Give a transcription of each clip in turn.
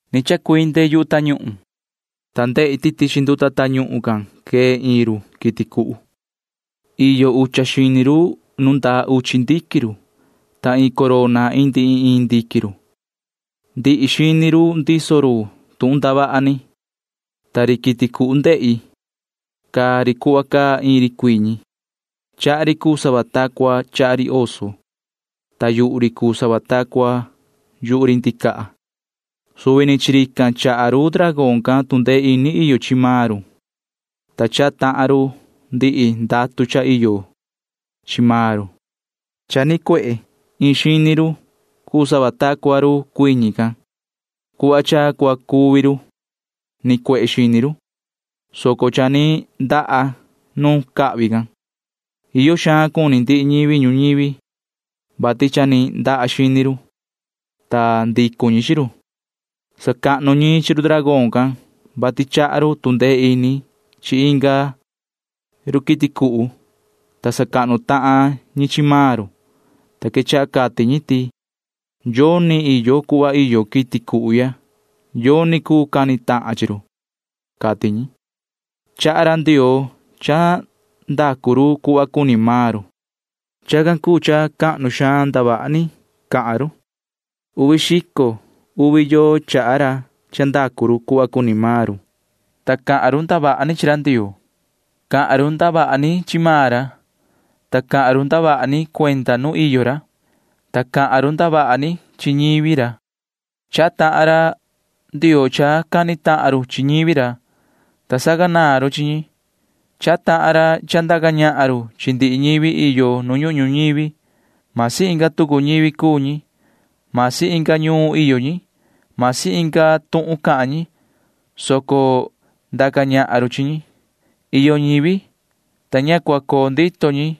Ni chacuinde yu tañuhun, ta ndehi ti tichi nduta tañuhun can quee iin ri quiti cuhu. Iyo ucha xini ri nu ndaa uchi ndiquin ri, ta iin corona indi iin iin ndiquin ri. Ndihi xini ri ndiso ri tuhun ndavaha ni, ta ri quiti cuhu ndehi―caa ri cuhva caa iin ri cuiñi. Chaha ri cuu sava ta cua chaha ri oso, ta yuhu ri cuu sava ta cua yuhu ri ndicaha. Suvi ni chi rican chaha ri dragón can tu ndee ini iyo chi maan ri, ta chaha tahan ri ndihi ndatu cha iyo chi maan ri. Cha ni nicuehe iin xini ri cuu sava ta cua ri cuiñi can. Cuhva cha cua cuvi ri nicuehe xini ri, soco cha ni ndaha nu cahvi can. Iyo xaan cuni ndihi ñivi ñuñivi, vati cha ni ndaha xini ri, ta ndicu ñi chi ri. Sacahnu ñi chi ri dragón can, vati chaha ri tu ndee ini chi inga ri quiti cuhu, ta sacahnu tahan ñi chi maan ri, ta quechaha cati ñi ti: ―Yoni iyo cuhva iyo quiti cuhu ya. Yoni cuu cani tahan chi ri ―cati ñi. Chaha ra Ndioo cha ndacu ri cuhva cuni maan ri. Chacan cuu cha cahnu xaan ndavaha ni cahan ri. Uvi xico uvi yoo chaha ra cha ndacu ri cuhva cuni ri, ta cahan ri ndavaha ni chi ra Ndioo. Cahan ri ndavaha ni chi maan ra, ta cahan ri ndavaha ni cuenda nu iyo ra, ta cahan ri ndavaha ni chi ñivi ra. Chaha tahan ra Ndioo cha cani tahan ri chi ñivi ra, ta sacanaan ri chi ñi. Chaha tahan ra cha ndaca ñahan ri chi ndihi ñivi iyo nu ñuhun ñuñivi. Masi inga tucu ñivi cuu ñi, masi inga ñuun iyo ñi, masi inga tuhun cahan ñi, soco ndaca ñahan ri chi ñi. Iyo ñivi, ta ña cua coo ndito ñi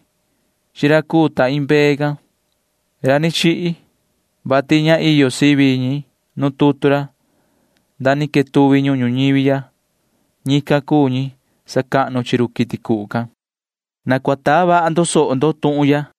chi ra cuu ta iin mbee can―ra ni chihi, vati ña iyo sivi ñi nu tutu ra, ta ni quetuvi ñuhun ñuñivi ya. Ñican cuu ñi sacahnu chi ri quiti cuhu can. Na cua taa vaha ndo soho ndo tuhun ya.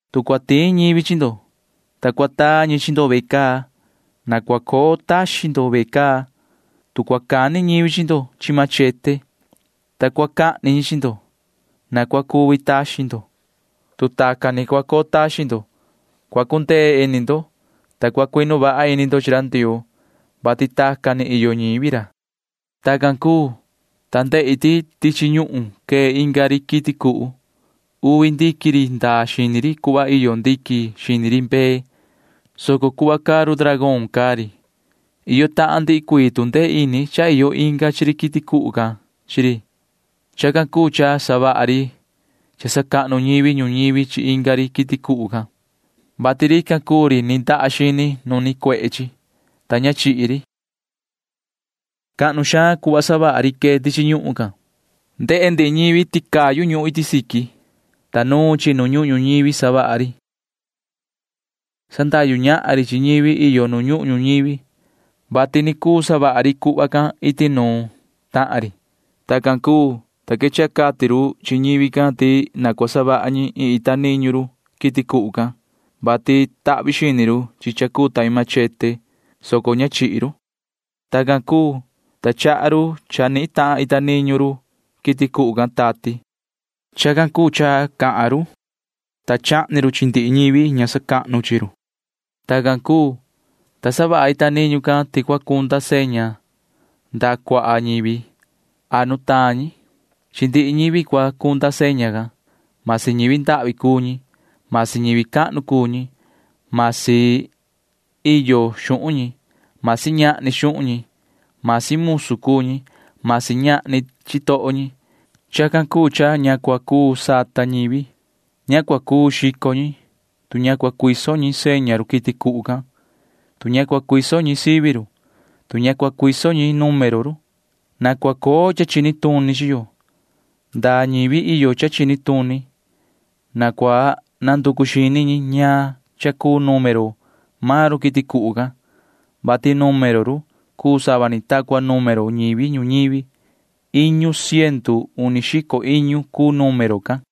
Tu cua tiin ñivi chi ndo, ta cua taa ñi chi ndo ve caa, na cua coo taxin ndo ve caa. Tu cua cani ñivi chi ndo chi machete, ta cua cahni ñi chi ndo, na cua cuvi taxin ndo. Tu tacan ni cua coo taxin ndo, cua cundee ini ndo, ta cua cuinu vaha ini ndo chi ra Ndioo, vati tacan ni iyo ñivi ra. Tacan cuu, ta ndehi ti tichi ñuhun quee inga ri quiti cuhu. Uvi ndiquin ri ndaa xini ri cuhva iyo ndiquin xini ri mbee, soco cuhva cahan ri dragón cahan ri. Iyo tahan ndihi cuii tu ndee ini cha iyo chi inga ri quiti cuhu can chi ri. Chacan cuu cha savaha ri cha sacahnu ñivi ñuñivi chi inga ri quiti cuhu can, vati rican cuu ri ni ndaha xini nu nicuehe chi, ta ña chihi ri. Cahnu xaan cuhva savaha ri quee tichi ñuhun. Ndehe ndihi ñivi ti cayu ñuhun iti siqui, ta nuun chi nu ñuhun ñuñivi savaha ri. Sandahyu ñahan ri chi ñivi iyo nu ñuhun ñuñivi, vati ni cuu savaha ri cuhva can iti nuun tahan ri. Tacan cuu, ta quechaha cati ri chi ñivi can ti na cua savaha ñi iin ita niñu ri quiti cuhu can, vati tahvi xini ri chi cha cuu ta iin machete, soco ña ni chihi ri. Tacan cuu, ta chaha ri cha nihin tahan ita niñu ri quiti cuhu can tati. Chacan cuu cha cahan chi, ta chahni chi chi ndihi ñivi ña sacahnu chi chi. Tacan cuu, ta savaha ita niñu can ti cua cunda seña ndaha cuaha ñivi a nutaan ñi. Chi ndihi ñivi cua cunda seña can―masi ñivi ndahvi cuu ñi, masi ñivi cahnu cuu ñi, masi iyo xuhun ñi, masi ñahni xuhun ñi, masi musu cuu ñi, masi ñahni chitoho ñi. Chacan cuu cha ña cua cuu sata ñivi. Ña cua cuu xico ñi, tu ña cua cuiso ñi seña ri quiti cuhu can, tu ña cua cuiso ñi sivi ri, tu ña cua cuiso ñi número ri. Na cua coo cha chini tuni chi yo. Ndaa ñivi iyo cha chini tuni―na cua nanducu xini ñi ñaan cha cuu número maan ri quiti cuhu can, vati número ri cuu sava ni ta cua número ñivi ñuñivi. Iñu ciendu uni xico iñu cuu número can.